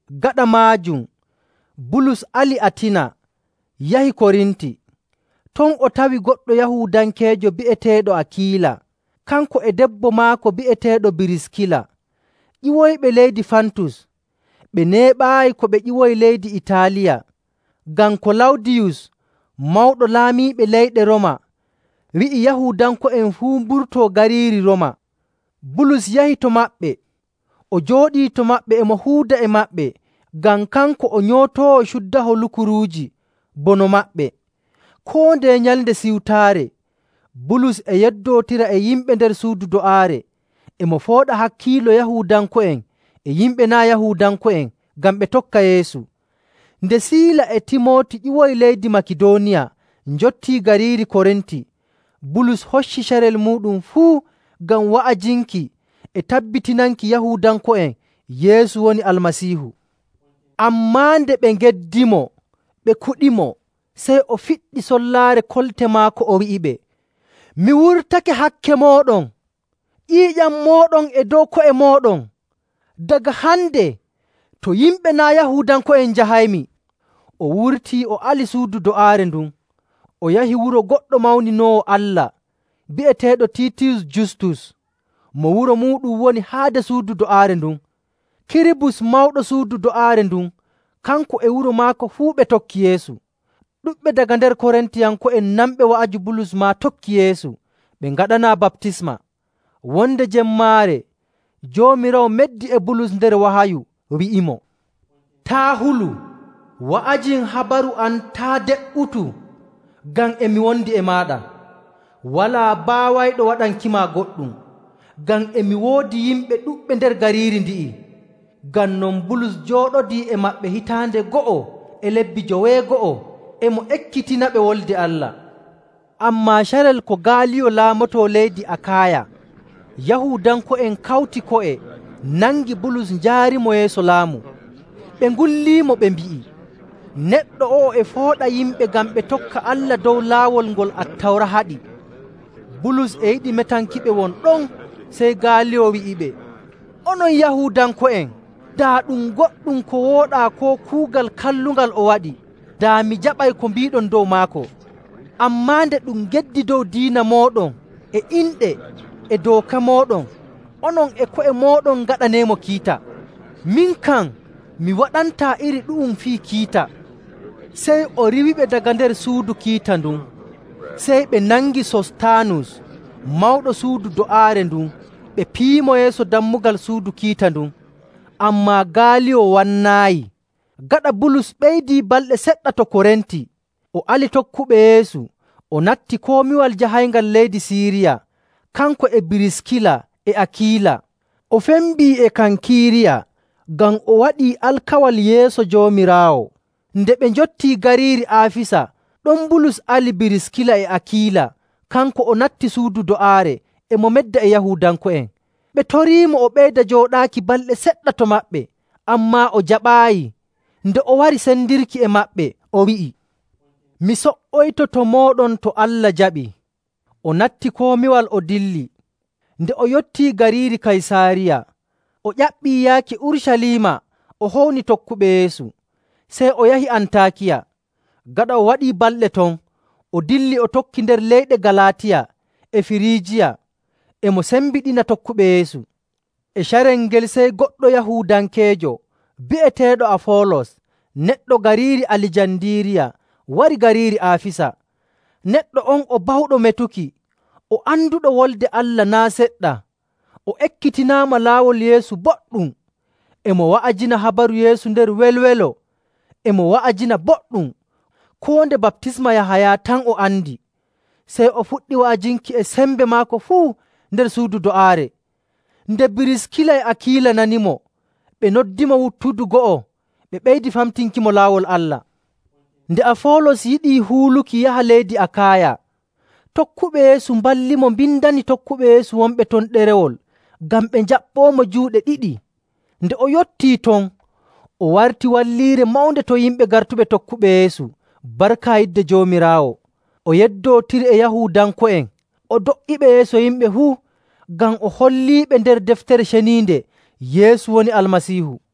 Gaɗa maajum, Bulus ali Atina, yahi Korinti. Ton o tawi goɗɗo Yahuudankeejo bi'eteeɗo Akiila, kanko e debbo maako bi'eteeɗo Biriskila, ƴiwoyɓe leydi Fantus. Ɓe neeɓaayi ko ɓe ƴiwoyi leydi Itaaliya, ngam Kalawdiyus, Mawɗo Laamiiɓe leyɗe Rooma, wi'i Yahuudanko'en fuu mburtoo gariiri Rooma. Bulus yahi to maɓɓe. O jooɗii to maɓɓe, e mo huuda e maɓɓe ngam kanko o nyootoowo cuddaho lukuruuji bono maɓɓe. Koo ndeye Nyalnde Siwtaare, Bulus e yeddootira e yimɓe nder suudu do'aare, e mo fooɗa hakkiilo Yahuudanko'en e yimɓe naa' Yahuudanko'en ngam ɓe tokka Yeesu. Nde Siila e Timooti ƴiwoyi leydi Makidooniya njottii gariiri Korinti, Bulus hocci carel muuɗum fuu ngam wa'ajinki e tabbitinanki Yahuudanko'en Yeesu woni Almasiihu. Ammaa nde ɓe ngeddimo, ɓe kuɗimo. Sey o fiɗɗi sollaare kolte maako, o wi'iɓe, “Mi wurtake hakke mooɗon! Ƴiiƴam mooɗon e dow ko'e mooɗon. Daga hande, to yimɓe naa' Yahuudanko'en njahaymi.” O wurtii o ali suudu do'aare ndun, o yahi wuro goɗɗo mawninoowo Allah, bi'eteeɗo Tiitiyus Justus, mo wuro muuɗum woni haade suudu do'aare ndun. Kiribus, mawɗo suudu do'aare ndun, kanko e wuro maako fuu ɓe tokki Yeesu. Ɗuɗɓe daga nder Korintiyanko'en nanɓe wa'aju Bulus maa tokki Yeesu, ɓe ngaɗanaa baptisma. Wonde jemmaare Joomiraawo meddi e Bulus nder wahayu, wi'imo, “Taa' hulu! Wa'ajin habaru am, taa' de''utu, ngam e mi wondi e maaɗa. Walaa baawayɗo waɗankima goɗɗum, ngam e mi woodi yimɓe ɗuɗɓe nder gariiri ndi'i.” Ngam non Bulus jooɗodii e maɓɓe hitaande go'o e lebbi joweego'o, e mo ekkitinaɓe Wolde Allah. Ammaa carel ko Gaaliyo laamotoo leydi Akaaya, Yahuudanko'en kawti ko'e, nangi Bulus, njaarimo yeeso laamu. Ɓe ngulliimo, ɓe mbi'i, “Neɗɗo o'o e fooɗa yimɓe ngam ɓe tokka Allah dow laawol ngol Attawra haɗi.” Bulus e yiɗi metankiɓe won ɗon, sey Gaaliyo wi'iɓe, “Onon Yahuudanko'en, daa ɗum goɗɗum ko wooɗaa koo kuugal kallungal o waɗi, daa mi jaɓay ko mbiiɗon dow maako. Ammaa nde ɗum geddi dow diina mooɗon, e inɗe, e dooka mooɗon, onon e ko'e mooɗon ngaɗaneemo kiita. Min kam, mi waɗantaa iri ɗu'um fii kiita!” Sey o riiwiɓe daga nder suudu kiita ndun. Sey ɓe nangi Sostaanus, mawɗo suudu do'aare ndun, ɓe piyimo yeeso dammugal suudu kiita ndun. Ammaa Gaaliyo wannaayi. Gaɗa Bulus ɓeydii balɗe seɗɗa to Korinti, o ali tokkuɓe Yeesu, o natti komiwal jahayngal leydi Siiriya, kanko e Biriskila e Akiila. O fembi e Kankiiriya ngam o waɗii alkawal yeeso Joomiraawo.. Nde ɓe njottii gariiri Aafisa, ɗon Bulus ali Biriskila e Akiila. Kanko o natti suudu do'aare, e mo medda e Yahuudanko'en. Ɓe toriimo o ɓeyda jooɗaaki balɗe seɗɗa to maɓɓe, ammaa o jaɓaayi. Nde o wari sendirki e maɓɓe, o wi'i, “Mi so''oyto to mooɗon to Allah jaɓii.” O natti komiwal, o dilli. Nde o yottii gariiri Kaysaariya, o ƴaɓɓii yaaki Urucaliima o howni tokkuɓe Yeesu. Sey o yahi Antaakiya. Gaɗa o waɗii balɗe ton, o dilli o tokki nder leyɗe Galaatiya e Firiijiya, e mo sembiɗina tokkuɓe Yeesu. E carel ngel sey goɗɗo Yahuudankeejo bi'eteeɗo Afoolos neɗɗo gariiri Alijandiiriya wari gariiri Aafisa. Neɗɗo on o bawɗo metuki, o anduɗo Wolde Allah naa' seɗɗa. O ekkitinaama Laawol Yeesu boɗɗum. E mo wa'ajina habaru Yeesu nder welwelo, e mo wa'ajina boɗɗum, koo nde baptisma Yahaya tan o andi. Sey o fuɗɗi wa'ajinki e sembe maako fuu nder suudu do'aare. Nde Biriskila e Akiila nanimo, ɓe noddimo wuttudu go'o, ɓe ɓeydi famtinkimo Laawol Allah. Nde Afoolos yiɗi huuluki yaha leydi Akaaya, tokkuɓe Yeesu mballimo mbindani tokkuɓe Yeesu wonɓe ton ɗerewol ngam ɓe njaɓɓoomo juuɗe ɗiɗi. Nde o yottii ton, o warti wallirre mawnde to yimɓe gartuɓe tokkuɓe Yeesu barka yidde Joomiraawo. O yeddootiri e Yahuudanko'en o do''iɓe yeeso yimɓe fuu, ngam o holliiɓe nder Deftere Ceniinde Yeesu woni Almasiihu.